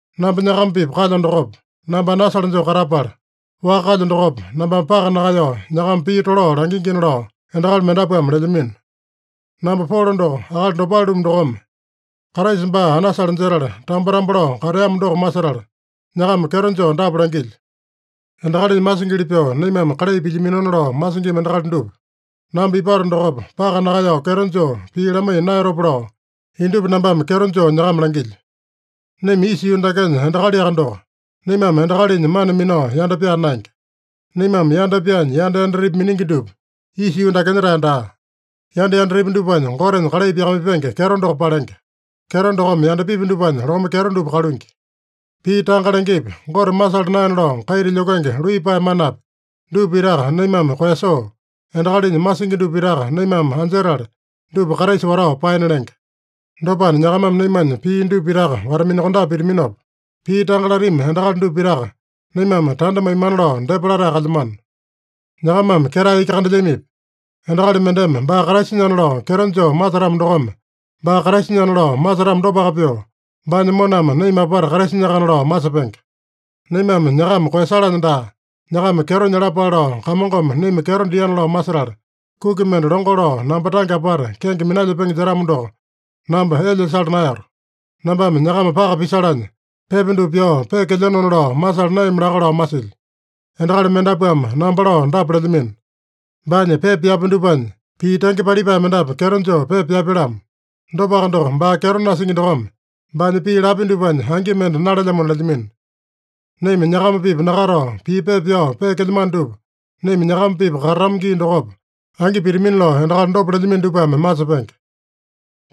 Namba nyakama-pipa kalyo dokopa, namba anasale joo katapala, waka kalyo dokopa, nambame paka nakaeyao nyakama pii tolao langingina lao endakali mendapuame lelyamino. Namba Polo doko akali dopale-lumu dokome, Kraisa baa anasale jetala, tambo-tambo lao kateamo doko masetala, nyakama kyeto joo dapa langilyo: Endakalinya masingili pyoo naimame kalai pilyaminona lao masingima endakali dupa, namba ipato dokopa, paka nakaeyao kyeto joo pii lamaiya naeyatopa lao, indupa nambame kyeto joo nyakama langilyo. Naima isa yuu dakenya endakaliaka doko, naimame endakalinya mana minao yanda pyaa naenge. Naimame yanda pyaanya yanda yandatepi miningi dupa isa yuu dakenya-tae daa. Yanda yandatepi dupanya Gotenya kalai pyakamaipenge kyeto doko palenge. Kyeto dokome yandapipi dupanya lome kyeto dupa kaluingi. Pii tanga lengepi, Gote masala naena lao kaita lyokenge luiyapae manapi, dupa pitaka naimame koeyasoo, endakalinya masingi dupa pitaka naimame anjetala, dupa Kraisa watao paena lenge. Dopana nyakamame naimanya pii dupa pitaka wata-minakondape pitaminopa, pii tanga latami endakali dupa pitaka naimame tanda maimana lao depa latae kalyamano. Nyakamame ketae iki kandelyamipi? Endakali mendeme baa Kraisanyana lao kyeto joo masetamo dokome, baa Kraisanyana lao masetamo dopaka pyoo, baanya moname naima apata Kraisanyakana lao masepenge. Naimame nyakama koeyasalanya daa, nyakama kyeto nyalapale lao Kamongome naima kyeto diana lao masetala, kuki mende longo lao namba tange apata kenge minalyepenge jetamo doko, namba elya sala naeyato. Nambame nyakama paka pisalanya, pepa dupa pyao peekelyenona lao masala naeyami laka lao masilyo. Endakali mendapuame namba lao dapa lelyamino: “Baanya pepa pyapya dupanya pii tenge palipae mendapu kyeto joo pepa pyapya-lamo. Dopaka doko, baa kyeto nasingi dokome baanya pii lapya dupanya angi mende nalelyamona” lelyamino. Naima nyakama-pipa nakatao pii pepa pyao peekelyamano dupa, naima nyakama-pipa katatama gii dokopa angi pitamina lao endakali dopa lelyamino dupame masepenge.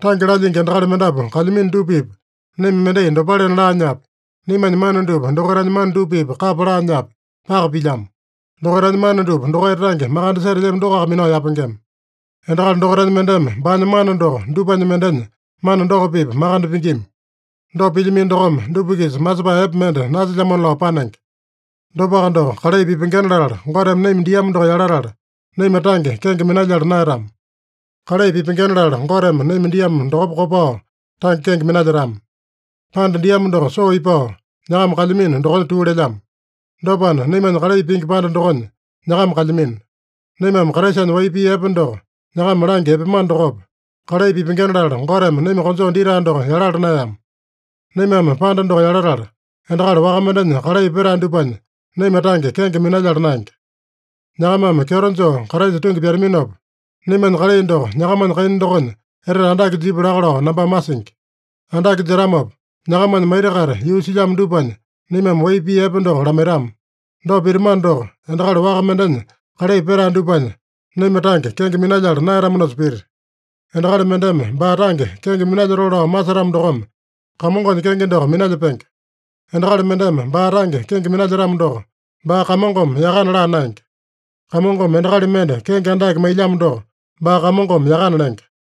Tange lalyingi endakali mendapu kalyamino dupa-pipa naima mendai dopalena laanyapi, naimanya mana dupa dokaitanya mana dupa-pipa kapa laanyapi, paka pilyamo. Dokaitanya mana dupa dokaita tange makande setelyami dokoaka minao yapengema. Endakali dokaitanya mendeme baanya mana doko dupanya mendenya mana doko-pipa makande pingima. Dopa pilyamino dokome, dupa-kisa masepae epe mende nasilyamona lao panenge. Dopaka doko, kalai pipengena latala Goteme naima diamo doko yalatala, naima tange kenge minalyala naeyatama. Kalai pipengena latala Goteme naima diamo dokopa kopao tange kenge minalyetama. Panda diamo doko soo ipao, nyakama kalyamino dokonya tuu lelyamo. Dopana, naimanya kalai pingi panda dokonya nyakama kalyamino. Naimame Kraisanya wai pii epe doko nyakama langya epeamano dokopa, kalai pipengena latala Goteme naima konjoo ditae doko yalala naeyama. Naimame panda doko yalatala, endakali waka mendenya kalai petae dupanya naima tange kenge minalyala naenge. Nyakamame kyeto joo Kraisa tungi pyataminopa, naimanya kalai doko nyakamanya kaina dokonya etete andake jipya laka lao nambame masingi. Andake jetamopa, nyakamanya maita-kaita yuu silyamo dupanya naimame wai pii epe doko lamaitama. Dopa pitamano doko, endakali waka mendenya kalai petae dupanya naima tange kenge minalyala naeyatamanosa pita. “Endakali mendeme baa tange kenge minalyotoo lao masetamo dokome Kamongonya kenge doko minalyepenge.” Endakali mendeme baa tange kenge minalyetamo doko, baa Kamongome yakana laa naenge. Kamongome endakali mende kenge andake mailyamo doko, baa Kamongome yakana lenge.